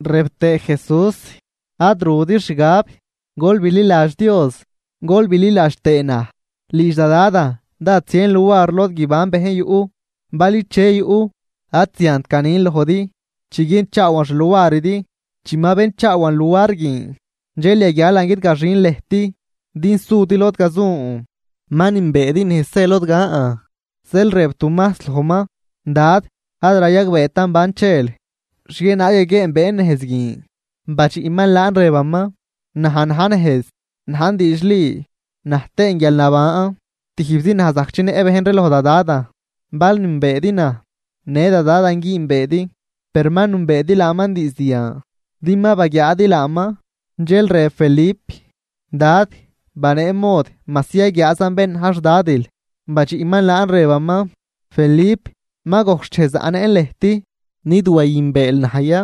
Rëb tëë Jesús: ―Ad rudi xgab. Gol bililadx Dios, gol bililadx tëë naj. Lidx da Dadan dád zien luar lod guiban bejn yuꞌ. Bal iche yuꞌ, ad ziant ganin lojdi, chiguienchaawan xluaridi. Chi ma benchaawan luar guin, dxel yaguialan guidgaxin lëjt din sudi lod gazun. Ma nünbeedi nejz zë lod gan. Zeel rëb Tumajs lojman: ―Dad, ad rayagbeetan ban chel, ¿xhienaag yaguieenbeen nejz guin? Badxiꞌman laan rëbaman: ―Naj na̱j nejz, najn diidxli, naj tëën guialnaban. Tijbzi naj zajc chinëꞌ bejn ree loj da Dadan. Bal nünbeedi naj, në da Dadan güünbeedi. Per ma nünbeedi laaman diizd yan, din ma baguiaadi laaman. Dxel rëb Felip: ―Dad, banee mod majsi yaguiaazan bén na̱j xDadil. Badxiꞌman laan rëbaman: ―Felip, ma gojc xchej zaꞌnëꞌn lëjt. ¿Nid wayünbeel naj ya?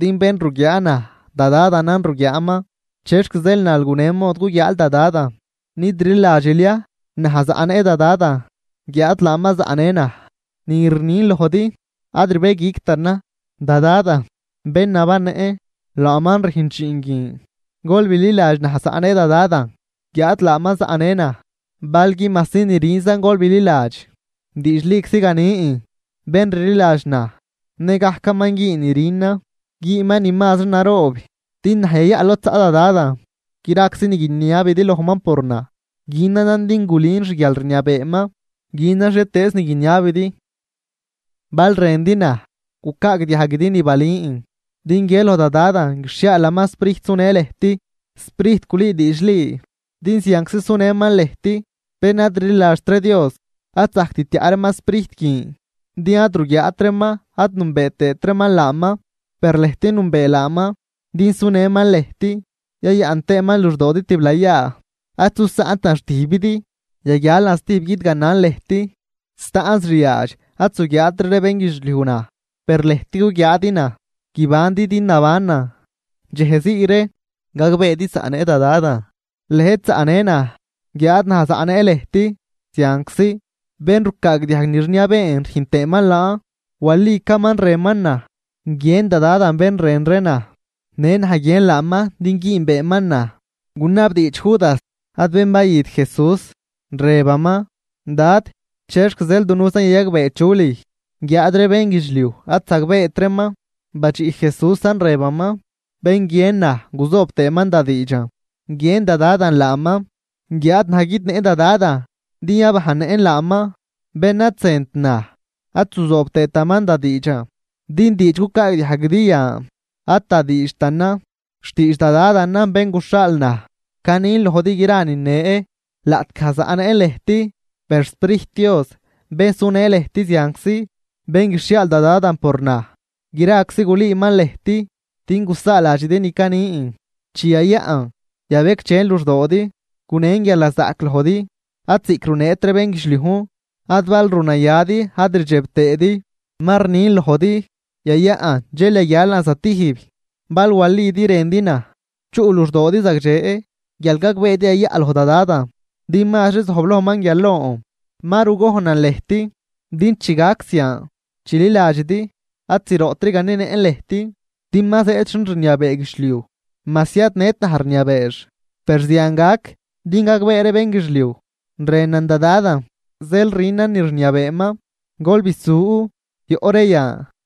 Din bén ruguiaa naj, da Dadanan ruguiaaman. ¿Chexc zeel nal gunen mod guguiaal da Dadan? ¿Nid rliladxil ya, naj zaꞌnëꞌ da Dadan, guiáad laaman zaꞌnë naj? Ni rnin lojdi, ad rbëguictanan. Da Dadan, bén nabannëꞌn, laaman rüjn dxiin guin. Gol bililadx naj zaꞌnëꞌ da Dadan, guiáad laaman zaꞌnë naj. Balgui majsi ni rünzan gol bililadx. Diidxliczi ganin: Bén rliladx naj, nëgajcaman güün ni rünan, güünman ni mazri naroob, din naj yayaꞌ lod zaꞌ da Dadan. Graczi ni guiniabidi lojman por naj, günanan din gulün xguialrniabeeman. Günan xhietëëz ni guiniabidi. ’Bal rëndi naj, gucaagdiajguidi ni balün. Din guië loj da Dadan guixhiaalaman Sprijt sunë lëjt, Sprijt gulüü diidxli, din zianczi sunëman lëjt. Bén ad rliladxt ree Dios ad zajct tiaꞌ reeman Sprijt guin, din ad ruguiaat reeman ad nünbee tëët reeman laaman. Per lëjt nünbee laaman, din sunëman lëjt yayaꞌn tëëman luxdoodi tiblayaa. Ad zusaꞌntan xtijbidi, yaguialan stijb guidganan lëjt. Staꞌnz riaadx ad zuguiaatri ree bénguidxliuj naj, per lëjt guguiaadi naj, guibandi din nabanan. Dxej zii ree, gagbeedi zaꞌnëꞌ da Dadan, lëjt zaꞌnë naj, guiáad naj zaꞌnëꞌn lëjt zianczi. Bén rucaagdiajg ni rniabeen rüjn tëëman laan, walicaman rënman naj. Guiën da Dadan bén rën naj, në naj guiën laaman din güünbeeman naj. Gunabdiidx Judas (ad bén bayüt Jesús) rëbaman: ―Dad, ¿chexc zeel dunujzan yayagbee chu lüj, guiáad ree bénguidxliuj ad zagbeet reeman? Badxiꞌ Jesúsan rëbaman: ―Bén guiën naj guzoobaman da diidxan, guiën da Dadan laaman, guiáad naj guidnëꞌ da Dadan din yabajnnëꞌn laaman. Bén ad zënt naj ad zuzoobtaman da diidxan, din diidx cucaagdiajguidi yan ad da diidxtanan, xtiidx da Dadanan bén guxhaal naj. ’Canin lojdi gra nine, laꞌtgaj zaꞌnëꞌn lëjt. Per xSprijt Dios, bén sunë lëjt zianczi, bén guixhiaal da Dadan por naj, graczi gulüüman lëjt din gusaaladxidi ni canin. ’Chi yayaꞌn, yabecdxen luxdoodi, gunen guialnazaꞌc lojdi, ad ziꞌc runeet ree bénguidxliujn, ad bal ru nayadi ad rdxeb tëëdi. Ma rnin lojdi, yayaꞌn, dxel yaguialan zatijb. Bal walidi rëndi naj, chuꞌ luxdoodi zagdxe, guial gagbeedi yayaꞌ loj da Dadan, din mazri zojblojman guial lon. Ma rugojnan lëjt, din chi gac zian, chililadxidi. ’Ad zroꞌtri ganenëꞌn lëjt, din ma zëëd xin rniabee guidxliuj, majsi ad nët naj rniabeex. Per zian gac din gagbee ree bénguidxliuj, rënan da Dadan, zeel rünan ni rniabeeman. Gol bisu, yoꞌ ree yan.